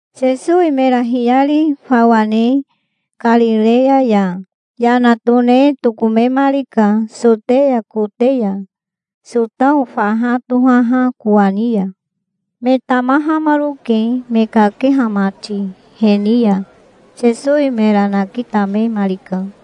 Sesowi mera hiyari fawa ne Karireya ya yana tone tokomemarika Soteya kote ya, Sotao faha tohaha kowani ya. Me tamahamaroke me kakeha mati he ni ya. Sesowi mera nakitamemarika.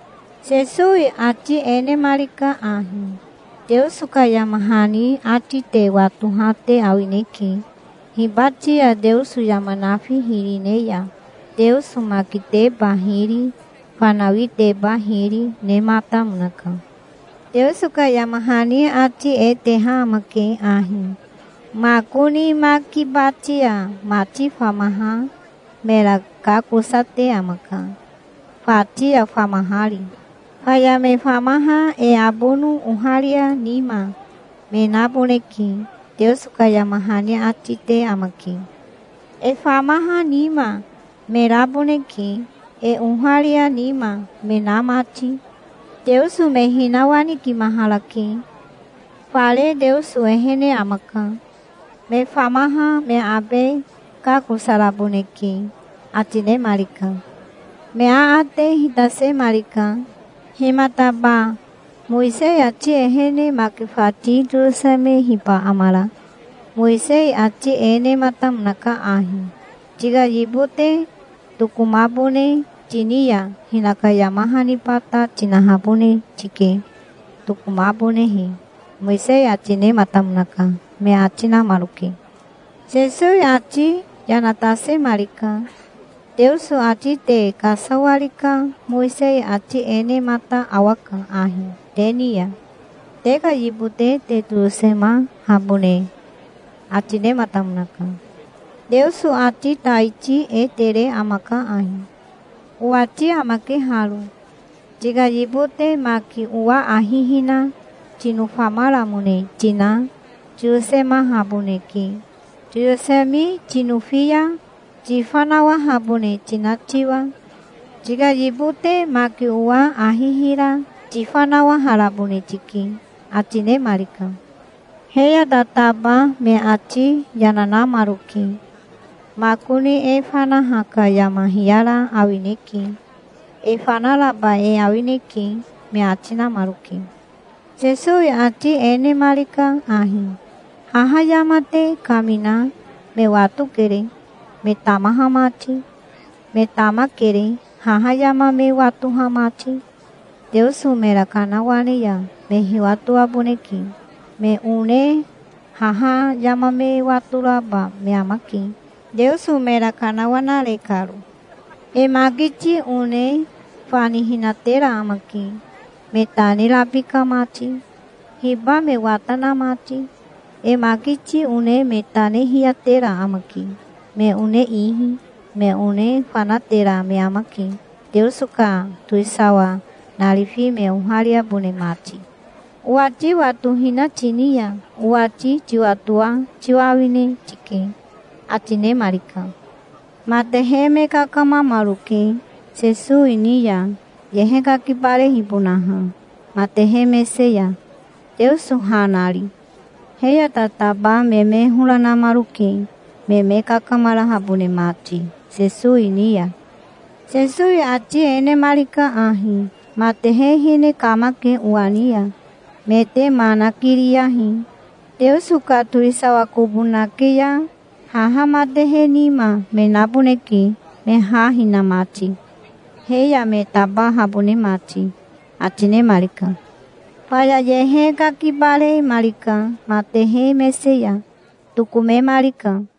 Sesowi ati e nemarika ahi: "Teoso ka yama hani ati te watoha te awineke. Hibati ya Teoso yama nafi hiri ne ya Teoso makiteba hiri, fanawiteba hiri, nematamonaka. Teoso ka yama hani ati e teha amake ahi: 'Makoni maki bati ya mati famaha mera kakosate amaka, fati ya famahari. Faya me famaha e abono oharia nima me naboneke', Teoso ka yama hani ati te amake. E famaha nima me raboneke, e oharia nima me na mati. Teoso me hinawanikimaharake. Fare Teoso ehene amaka. Me famaha me abe kakosaraboneke", ati nemarika. Me aate hitasemarika. "Himataba Mowisei ati ehene maki fati toyosemehiba amara? Mowisei ati e nematamonaka ahi: 'Tika yibote tokomabone tini ya hinaka yama haniba ta tinahabone tike, tokomabonehe', Mowisei ati nematamonaka", me ati namaroke. Sesowi ati yana tasemarika. "Teoso ati te kasawari ka Mowisei ati e nemata awaka ahi te ni ya. Te ka yibote te toyosemahabone ati nematamonaka. Teoso ati taiti e tere amaka ahi. Owati amake haro. Tika yibote maki owa ahi hina tinofamaramone tina tiyosemahaboneke, toyosemi tinofi ya, tifanawahabone tina tiwa. Tika yibote maki owa ahi hira tifanawaharabone tike", ati nemarika. He ya tataba me ati yana namaroke. "Makoni e fanaha ka yama hiyara awineke. E fanaraba e awineke", me ati namaroke. Sesowi ati e nemarika ahi: "Haha yama te kamina me watokere, me tamaha mati. Me tamakere, haha yama me watoha mati. Teoso mera kanawane ya me hiwatoaboneke. Me one haha yama me watoraba me amake, Teoso mera kanawanare karo. E makiti one fanihinatera amake, me tane rabika mati, hiba me wata na mati. E makiti one me tane hiyatera amake me one ihi. Me one fanatera me amake, Teoso ka towisawa narifi me ohariabone mati. Owati watohina tini ya owati tiwatoa tiwa awine tike", ati nemarika. Matehe me kakamamaroke Sesowi ni ya, yehe kakibarehibonaha matehe mese ya, Teoso ha nari. He ya tataba me me hora namaroke, me me kakamarahabone mati Sesowi ni ya. Sesowi ati e nemarika ahi. "Matehe hine kamake owa ni ya. Me te ma nikiriyahi. Teoso ka towisawa kobo nake ya haha matehe nima me naboneke me ha hina mati, he ya me tabahabone mati", ati nemarika. Faya yehe kakibaremarika matehe mese ya. Tokomemarika.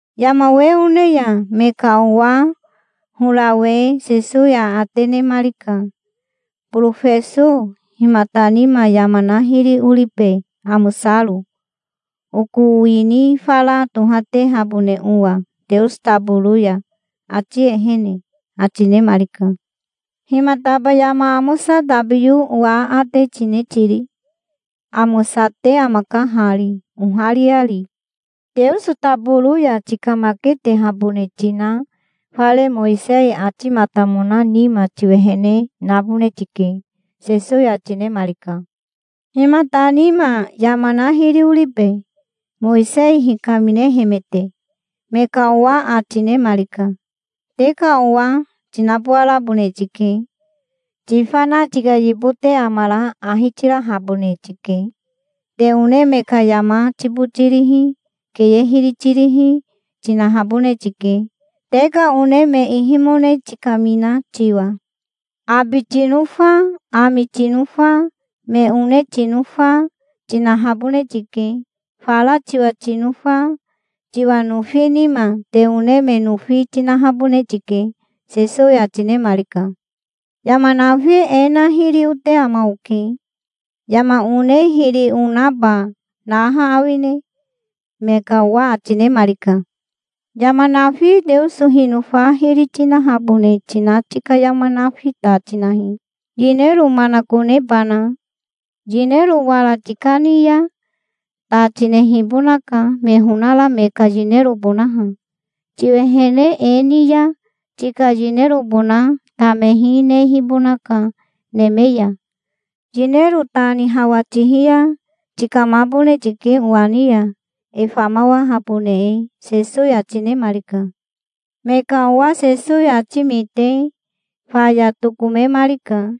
Yama we one ya me ka owa horawe Sesowi aate nemarika. "Borofeso himata nima yama na hiri oribe amosaro, oko wini fara tohatehabone owa Teoso taboro ya, ati ehene?" ati nemarika. "Himataba yama amosa tabiyo owa aate tine tiri? Amosate amaka hari, ohariari. Teoso taboro ya tikamaketehabone tina fare Mowisei atimatamona nima tiwehene nabone tike", Sesowi ati nemarika. "Himata nima yama na hiri oribe, Mowisei hikaminehemete?" me ka owa ati nemarika. "Te ka owa tinabowarabone tike. Tifana tika yibote amara ahi tirahabone tike. Te one me ka yama tibotirihi, keye hiri tirihi, tinahabone tike, te ka one me ihimone tikamina tiwa. Abi tinofa, ami tinofa, me one tinofa, tinahabone tike. Fara tiwa tinofa tiwa nofi nima te one me nofi tinahabone tike", Sesowi ati nemarika. "Yama nafi e na hiri ote ama oke. Yama one hiri onaba naha awine?" me ka owa ati nemarika. "Yama nafi Teoso hinofa hiri tinahabone tina tika yama nafi ta tinahi, yinero manakonebana. Yinero wara tikani ya ta tinehibonaka, me honara me ka yinerobonaha. Tiwehene e ni ya tika yinerobona tamehi nehibonaka neme ya. Yinero ta ni hawa tihi ya tikamabone tike owa ni ya, e famawahabone e", Sesowi ati nemarika. Me ka owa Sesowi ati mite faya tokomemarika,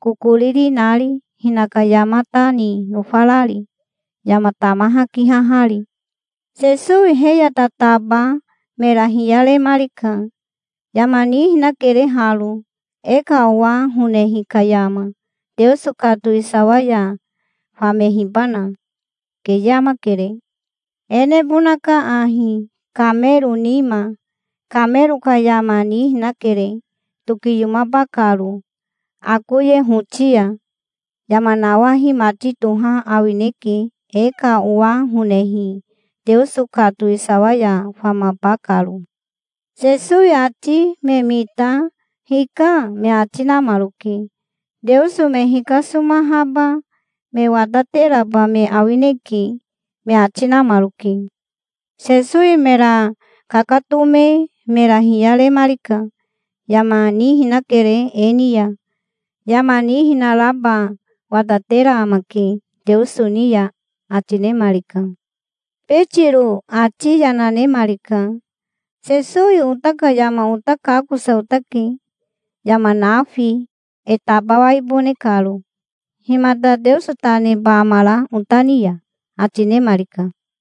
kokoriri nari, hinaka yama ta ni nofarari, yama tamaha kihahari. Sesowi he ya tataba mera hiyaremarika. "Yama nihinakere haro, e ka owa honehi ka yama, Teoso ka towisawa ya famehibana. Keye amakere. E nebonaka ahi, kamero nima. Kamero ka yama nihinakere, tokiyomaba karo akoye hoti ya. Yama nawahi mati toha awineke, e ka owa honehi Teoso ka towisawa ya famaba karo". Sesowi ati me mita "Hika", me ati namaroke. "Teoso me hikasomahaba me watateraba me awineke", me ati namaroke. Sesowi mera kakatome mera hiyaremarika. "Yama nihinakere e ni ya. Yama nihinaraba watatera amake Teoso ni ya", ati nemarika. Betiro ati yana nemarika. "Sesowi ota ka yama ota kakosa otake, yama nafi, e tabawaibone karo. Himata Teoso ta neba amara ota ni ya?" ati nemarika.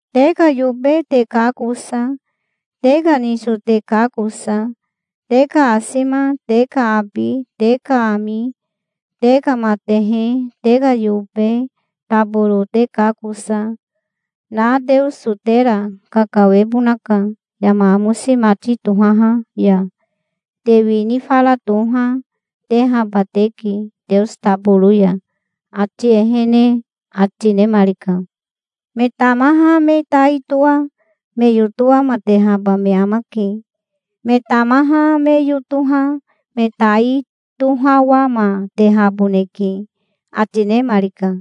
Te ka yobe te kakosa, te ka niso te kakosa, te ka asima, te ka abi, te ka ami, te ka matehe, te ka yobe taboro te kakosa, na Teoso tera kakawebonaka yama amosi mati tohaha ya. Te wini fara toha, tehaba teke Teoso taboro ya, ati ehene", ati nemarika. "Me tamaha me tai toa me yotowamatehaba me amake. Me tamaha me yotoha me tai tohawamatehaboneke", ati nemarika.